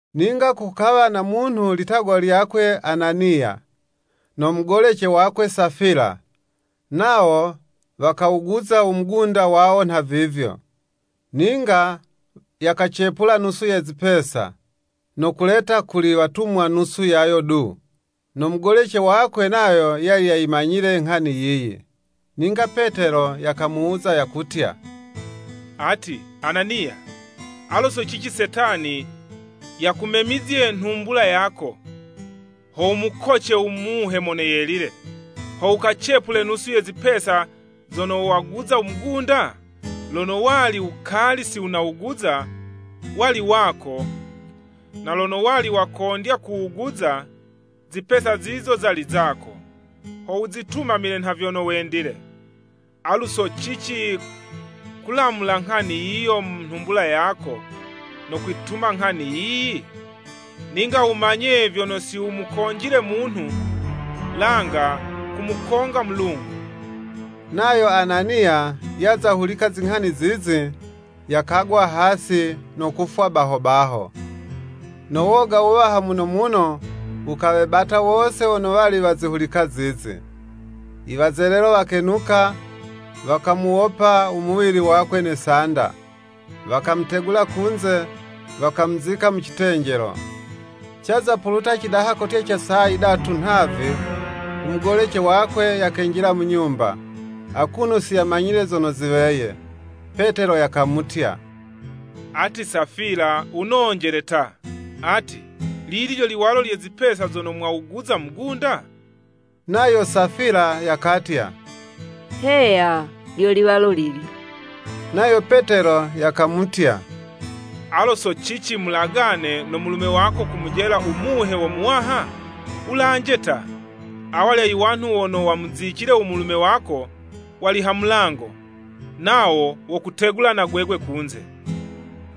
Ninga kukawa na munhu litagwa lyakwe Ananiya, no mugolece wakwe Safila, nawo wakawuguza u mugunda wawo nha vivyo. Ninga yakacepula nusu ye zipesa, no kuleta kuli watumwa nusu yayo du, no mugolece wakwe nayo yali yayimanyile nghani yiyi. Ninga Petelo yakamuwuza yakutya, “Ati, Ananiya, alo so cici Setani yakumemizye nhumbula yako, ho wumukoce u Muhe Mono Yelile, ho wukacepule nusu ye zipesa zono wawuguza mugunda? Lono wali wukali sinawuguza, wali wako, na lono wali wakondya kuwuguza, izipesa zizo zali zako, ho wuzitumamile nha vyono wendile. Alu so cici kulamula nghani yiyi mu nhumbula yako no kwituma nghani yiyi? Ninga wumanye vyono si wumukonjile munhu, langa kumukonga Mulungu!” Nayo Ananiya yaza hulika zinghani zizi, yakagwa hasi no kufwa baho baho. No woga wuwaha muno muno wukawebata wose wono wazihulika zizi. Iwazelelo wakenuka, wakawuwopa umuwili wakwe ne sanda, wakamutegula kunze, wakamuzika mu citenjelo. Caza kupuluta cidaha kotya ca saa yidatu nhavi, u mugolece wakwe yakenjila mu nyumba, akuno si yamanyile zono ziweye. Petelo yakamutya, “Ati Safila wunonjele ta, ati, lili lyo liwalo lye zipesa zono mwawuguza mugunda?” Nayo Safila yakatya, “Heya, lyo liwalo lilyo.” Nayo Petelo yakamutya, “Alo so cici mulagane no mulume wako kumujela u Muhe wo Muwaha?” Wulanje ta! Awalya iwanhu wono wamuzicile u mulume wako, wali ha mulango, nawo wokutegula na gwegwe kunze.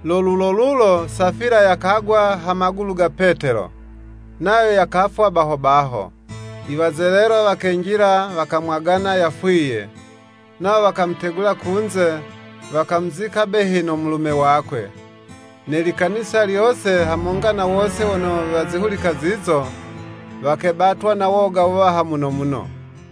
Lo lulo lulo Safila yakagwa ha magulu ga Petelo, nayo yakafwa baho baho. Iwazelelo wakenjila wakamwagana yafwiye, nawo wakamutegula kunze, wakamuzika behi no mulume wakwe. Ne likanisa lyose hamonga na wose wono wazihulika zizo, wakebatwa na woga wuwaha muno muno.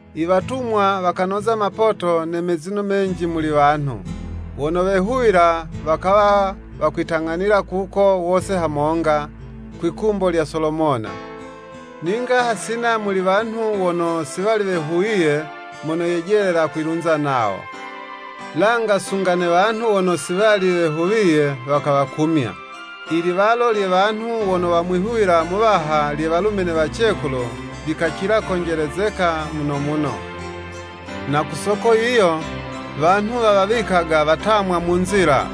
I Watumwa wakanoza mapoto ne mezino menji muli wanhu. Wono wehuwila, wakawa wakwitang'anila kuko wose hamonga, kwi'kumbo lya Solomona. Ninga, hasina muli wanhu wono si wali wehuwiye mono yejelela kwilunza nawo. Langa sunga ne wanhu wono si wali wehuwiye, wakawakumya. Iliwalo lye wanhu wono wamwihuwila Muwaha lye walume ne wacekulu, likacila konjelezeka muno muno. Na ku soko yiyo, wanhu wawawikaga watamwa mu nzila,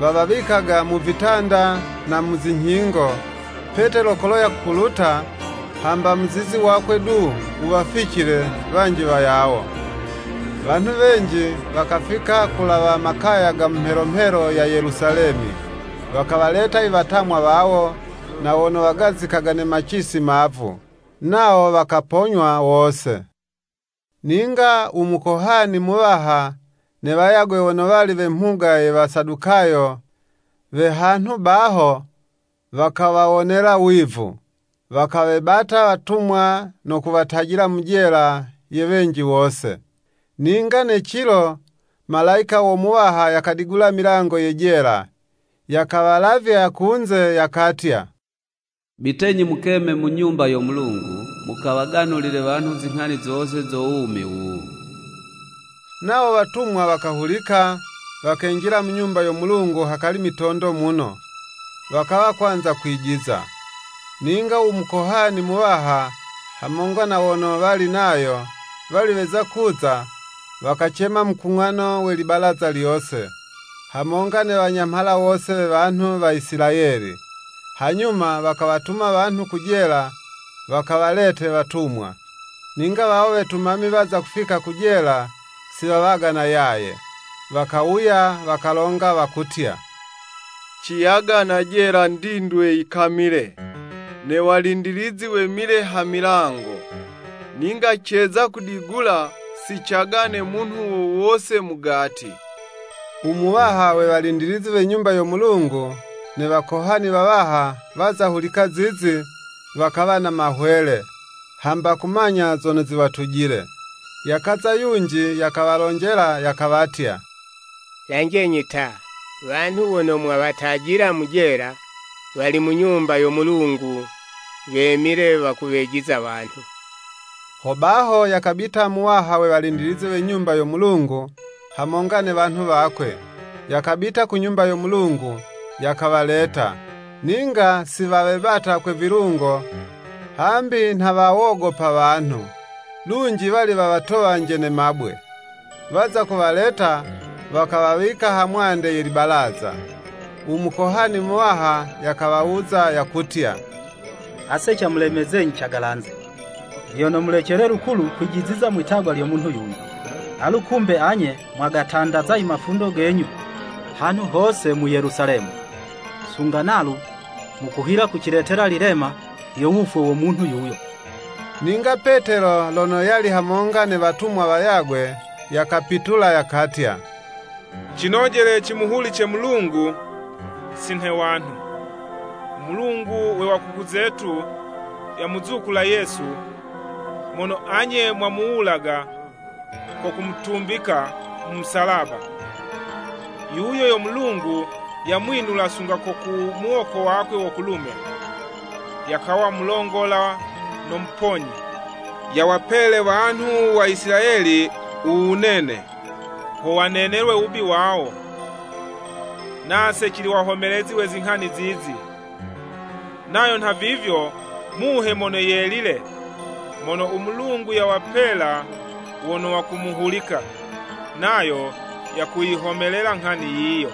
wawawikaga mu vitanda na mu zinyhingo, Petelo kolo yakupuluta, hamba muzizi wakwe du wuwaficile wanji wayawo. Wanhu wenji wakafika kulawa makaya ga mu mhelo mhelo ya Yelusalemi, wakuwaleta iwatamwa wawo, na wono wagazikaga ne macisi mavu, nawo wakaponywa wose. Ninga u mukohani muwaha ne wayagwe wono wali we mhuga ye Wasadukayo we hanhu baho, wakawawonela wivu. Wakawebata watumwa no kuwatajila mu jela ye wenji wose. Ninga ne cilo, Malayika wo Muwaha yakadigula milango ye jela, yakawalavya kunze, yakatya, “Bitenyi mukeme mu Nyumba yo Mulungu, mukawaganulile wanhu zinghani zose zo wumi wuwu.” Nawo watumwa wakahulika, wakenjila mu Nyumba yo Mulungu hakali mitondo muno, wakawa kwanza kwijiza. Ninga u Mukohani Muwaha, hamonga na wono wali nayo, wali weza kuza, wakacema mukung'ano we libalaza lyose, hamonga ne wanyamhala wose we wanhu wa Isilayeli, hanyuma wakawatuma wanhu ku jela wakawalete watumwa. Ninga wawo wetumami waza kufika ku jela, si wawagana yaye. Wakawuya, wakalonga, wakutya, “Ciyagana jela ndindwe yikamile, ne walindilizi wemile ha milango, ninga ceza kudigula, si cagane munhu wo wose mugati.” U Muwaha we walindilizi we Nyumba yo Mulungu ne wakohani wawaha, waza hulika zizi, wakawa na mahwele, hamba kumanya zono ziwatujile. Yakaza yunji yakawalonjela yakawatya, “Lanjenyi ta! Wanhu wono mwawatajila mu jela, wali mu Nyumba yo Mulungu wemile wakuwejiza wanhu.” Hobaho yakabita muwaha we walindilizi we Nyumba yo Mulungu, hamonga ne wanhu wakwe, yakabita ku Nyumba yo Mulungu, yakawaleta. Ninga si wawebata kwe vilungo hambi nha wawogopa wanhu, lunji wali wawatowanje ne mabwe. Waza kuwaleta, wakawawika ha mwande ye libalaza. U Mukohani muwaha yakawawuza, yakutya, “Ase camulemezenyi cagalanze, vyono mulecele lukulu kwijiziza mwi'tagwa lyo munhu yuyu, alu kumbe anye mwagatandaza imafundo genyu hanhu hose mu Yelusalemi, sunga nalu mukuhila kuciletela lilema lyo wufwe wo munhu yuyo.” Ninga Petelo lono yali hamonga ne watumwa wayagwe, yakapitula, yakatya, “Cinojele cimuhulice Mulungu, si nhe wanhu. U Mulungu we wakuku zetu yamuzukula Yesu, mono anye mwamuwulaga ko kumutumbika mu musalaba. Yuyo yo Mulungu yamwinula sunga ko ku muwoko wakwe wo kulume, yakawa Mulongola no Muponyi, yawapele wanhu Isilayeli u wunene, ho wanenelwe uwubi wawo. Nase cili wahomelezi we zinghani zizi, nayo nhavivyo Muhe Mono Yelile, mono u Mulungu yawapela wono wakumuhulika, nayo yakuyihomelela nghani yiyo.”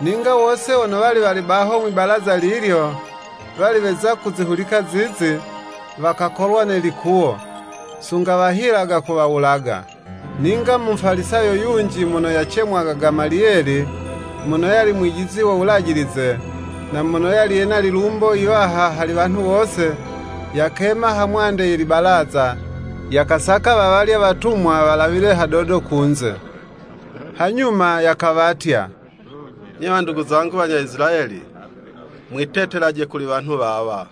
Ninga wose wono wali wali baho mwi'balaza lilyo wali weza kuzihulika zizi, wakakolwa ne likuwo, sunga wahilaga kuwawulaga. Ninga Mufalisayo yunji mono yacemwaga Gamaliyeli, mono yali mwijizi wo Wulajilize, na mono yali yena lilumbo yiwaha hali wanhu wose, yakema ha mwande ye libalaza, yakasaka wawalya watumwa walawile hadodo kunze. Hanyuma yakawatya, “Nye wandugu zangu wa Isilayeli, mwitetelaje kuli wanhu wawa,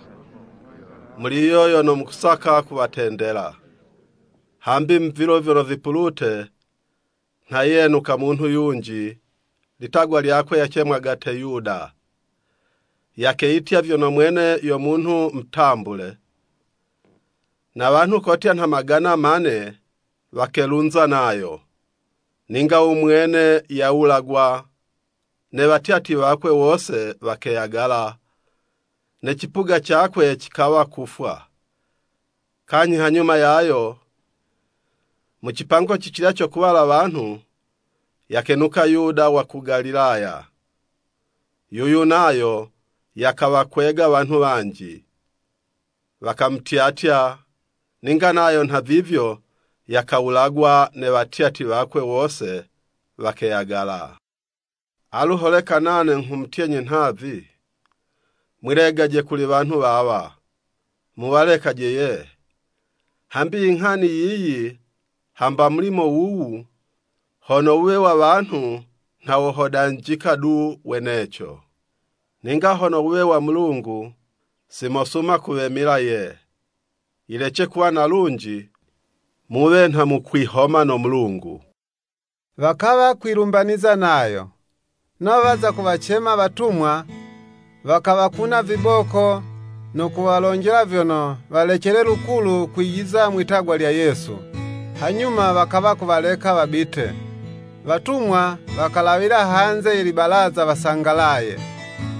muli yiyo yono mukusaka kuwatendela. Hambi mu vilo vyono vipulute nha yenuka munhu yunji, litagwa lyakwe yacemwaga Teyuda, yakeyitya vyono mwene yo munhu mutambule, na wanhu kotya nha magana ma'ne wakelunza nayo. Ninga u mwene yawulagwa, ne watyatyi wakwe wose wakeyagala, ne cipuga cakwe cikawa kufwa. Kanyhi hanyuma yayo, mu cipango cicilya co kuwala wanhu, yakenuka Yuda wa ku Galilaya. Yuyu nayo yakawakwega wanhu wanji, wakamutyatya, ninga nayo nha vivyo, yakawulagwa, ne watyatyi wakwe wose wakeyagala. Alu, holeka nane nghumutyenyi nhavi, mwilegaje kuli wanhu wawa, muwalekaje ye! Hambi inghani yiyi hamba mulimo wuwu, hono wuwe wa wanhu, nha wohodanjika du weneco. Ninga hono wuwe wo Mulungu, si mosuma kuwemila ye, yilece kuwa na lunji muwe nha mukwihoma no Mulungu.” Wakawa kwilumbaniza nayo. Nawo waza kuwacema watumwa, wakawakuna viboko, no kuwalonjela vyono, walecele lukulu kwijiza mwi'tagwa lya Yesu, hanyuma wakawa kuwaleka wabite. Watumwa wakalawila hanze ye libalaza wasangalaye,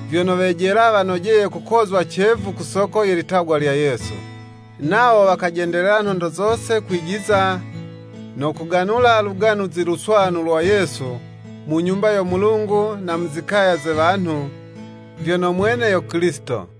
vyono wejela wanojeye kukozwa cevu ku soko ye litagwa lya Yesu. Nawo wakajendelela nhondo zose kwijiza no kuganula Luganuzi Luswanu lwa Yesu, mu Nyumba yo Mulungu na mu zikaya ze wanhu, vyono mwene yo Kilisito.